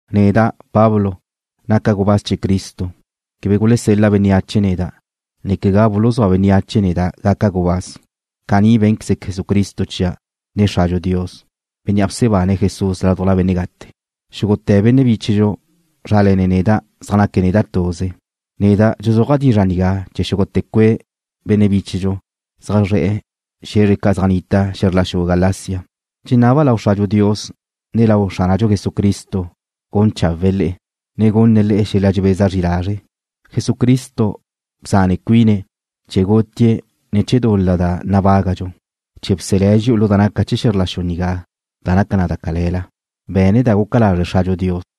Neda', Pablo, naca' gubáz chee̱ Cristo. Quebe gulesel-la bénneache neda', ne quegá buluzúa bénneache neda' gaca' gubáz. Caní bé̱nqueze Jesucristo chia', ne Xradxu Dios, Bénnea' bsebane̱' Jesús ládujla benne' gate. Xúgute̱ benne' bíchedxu zrále̱ne̱' neda' zaj naque̱' neda' tuze. Neda' dxuzúaja' dizra' nigá chee̱ xúgute̱ cue' benne' bíchedxu zaj zre̱'e̱ xe̱zre ca' zaj nnita' xe̱zr la xu Galacia. Dxenaba' lau Xradxu Dios, ne lau Xránadxu Jesucristo gun chawe̱'e̱ le'e, ne gunne̱' le'e xel-la dxebeza zri lazre'. Jesucristo bzane cuine̱' chee̱ gutie̱' ne̱ chee̱ dul-la da nabágadxu, chee̱ bselé̱' dxi'u lu da naca chee̱ xe̱zr la xu nigá da naca na da cale̱la. Be̱ne̱' da guca lazre' Xradxu Dios.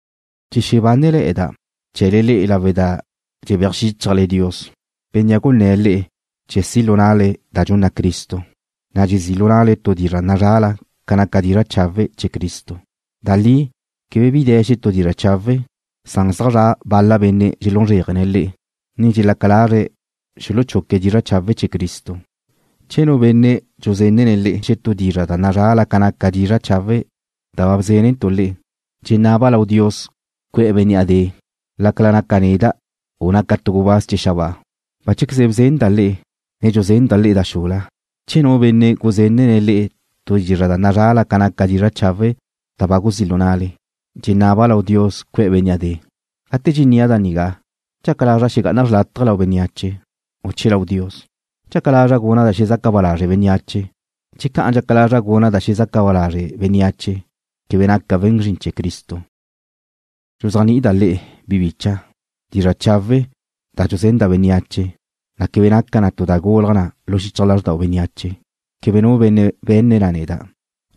Dxexebánele̱'e̱da' chee̱le le'e lawe' da dxebéaj xíchajte̱le Dios, Bénnea' gunné̱' le'e chee̱ si' lu na'le da dxunna Cristo, na' dxezí' lu na'le tu dizra' nazrala ca naca dizra' chawe' chee̱ Cristo. Da li quebe bi de̱ xetú dizra' chawe', san zaj zra' bal-la benne' dxelún zréajene̱' le'e, ne dxelaca lazre̱' xuluchuque̱' dizra' chawe' chee̱ Cristo. Che nu benne' dxuzenne̱' le'e xetú dizra' da nazrala ca naca dizra' chawe' da ba bzénentu' le'e, dxenaba' lau Dios cue̱'e̱ bénnea' de', lácala naca neda', u naca tu gubáz chee̱ xabáa. Báchequeze bzenda' le'e, ne dxuzenda' le'e da xula, che nu benne' guzenne̱' le'e tu dizra' da nazrala ca naca dizra' chawe' da ba guzí' lu na'le, dxenaba' lau Dios cue̱'e̱ bénnea' de'. Gate dxennia' da nigá, ¿Dxaca lazra' xegá'ana' xrlátaje lau bénneache, u che lau Dios? ¿Dxaca lazra' guna' da xelezaca ba lazre' bénneache? Che ca'an dxaca lazra' guna' da dxelezaca ba lazre' bénneache, quebe naca' we̱n zrin chee̱ Cristo. Dxuzéajni'ida' le'e, bi bicha', dizra' chawe' da dxuzenda' bénneache, na' quebe naca na tu da gulaj na lu xichaj lázrdau bénneache. Quebe nu benne' be̱nne̱' na neda',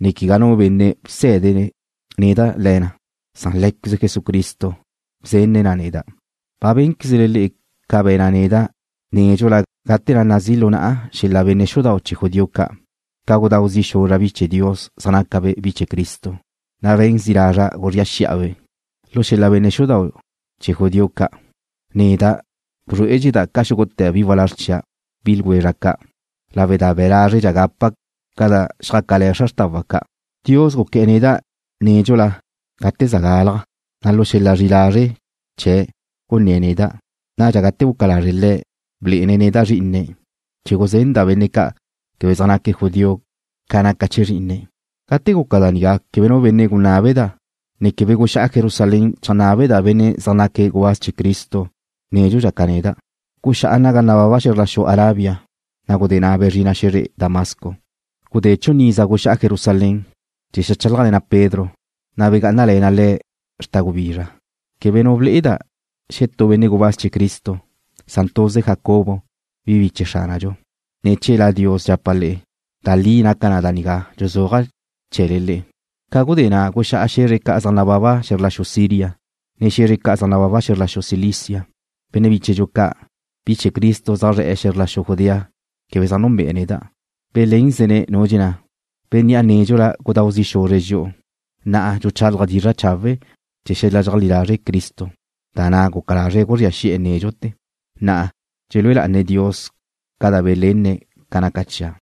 ne quegá nu benne' bsé̱dene̱' neda' le̱ na, san Lé̱queze Jesucristo bzenne̱' na neda'. Ba bénquezle ca be̱na' neda' nédxula gate na' nazí' lu na'a xel-la benne' xudau' chee̱ judío ca', ca gudáu zi' xuzra' bi chee̱ Dios zaj nácabe' bi chee̱ Cristo, ne be̱n zi' lazra' guzría xi'a-be'. Lu xel-la benne' xudau' chee̱ judío ca', neda' ba bzrué'edxeda' ca xúgute̱ bi walázr chia', bi ljwezra' ca', lawe' da be̱ lázredxa' gapa' ca da xjácale̱ xra xrtawa' ca'. Dios guqué̱'e̱ neda' nédxula gate za gálaja', na' lu xel-la zri'i lazre' chee̱' gunné̱' neda'. Nadxa gate guca lazre' Le̱', blé'ene̱' neda' Zrí'ine̱', chee̱ guzenda' benne' ca' quebe zaj naque̱' judío ca naca chee̱ Zrí'ine̱'. Gate guca da nigá, quebe nu benne' gunábeda', ne quebe guxá'a Jerusalén cheajnábeda' benne' zaj naque̱' gubáz chee̱ Cristo nédxudxa ca neda'. Guxá'a naga nababa xe̱zr la xu Arabia, na' gudé na' bezrina' xe̱zre Damasco. Gudé chun iza guxá'a Jerusalén, chee̱ xeajchálajle̱na' Pedro, na' begá'anale̱na' le̱' xta' gubizra. Quebe nu ble'eda' xetú benne' gubáz chee̱ Cristo, san tuze Jacobo, bi biche Xránadxu. Ne̱ chee̱ La Dios dxapa' le'e, da li naca da nigá dxuzúaja' chee̱le le'e. Ca gudé na' guxá'a xe̱zre ca' zaj nababa xe̱zr la xu Siria, ne xe̱zre ca' zaj nababa xe̱zr la xu Cilicia. Benne' bíchedxu ca', bi chee̱ Cristo zaj zre̱'e̱ xe̱zr la xu Judea quebe zaj nunbe'e̱ neda'. Belénzene̱' nu dxenná: “Bénnea' nédxula gudáu zi' xuzre̱' dxi'u, na'a dxuchálaje̱' dizra' chawe' chee̱ xel-la dxeajlí lazre' Cristo, da na' guca lazre̱' guzría xi'e̱ nédxute̱.” Na'a dxelúe lá'ane̱' Dios ca da belenne̱' ca naca chia'.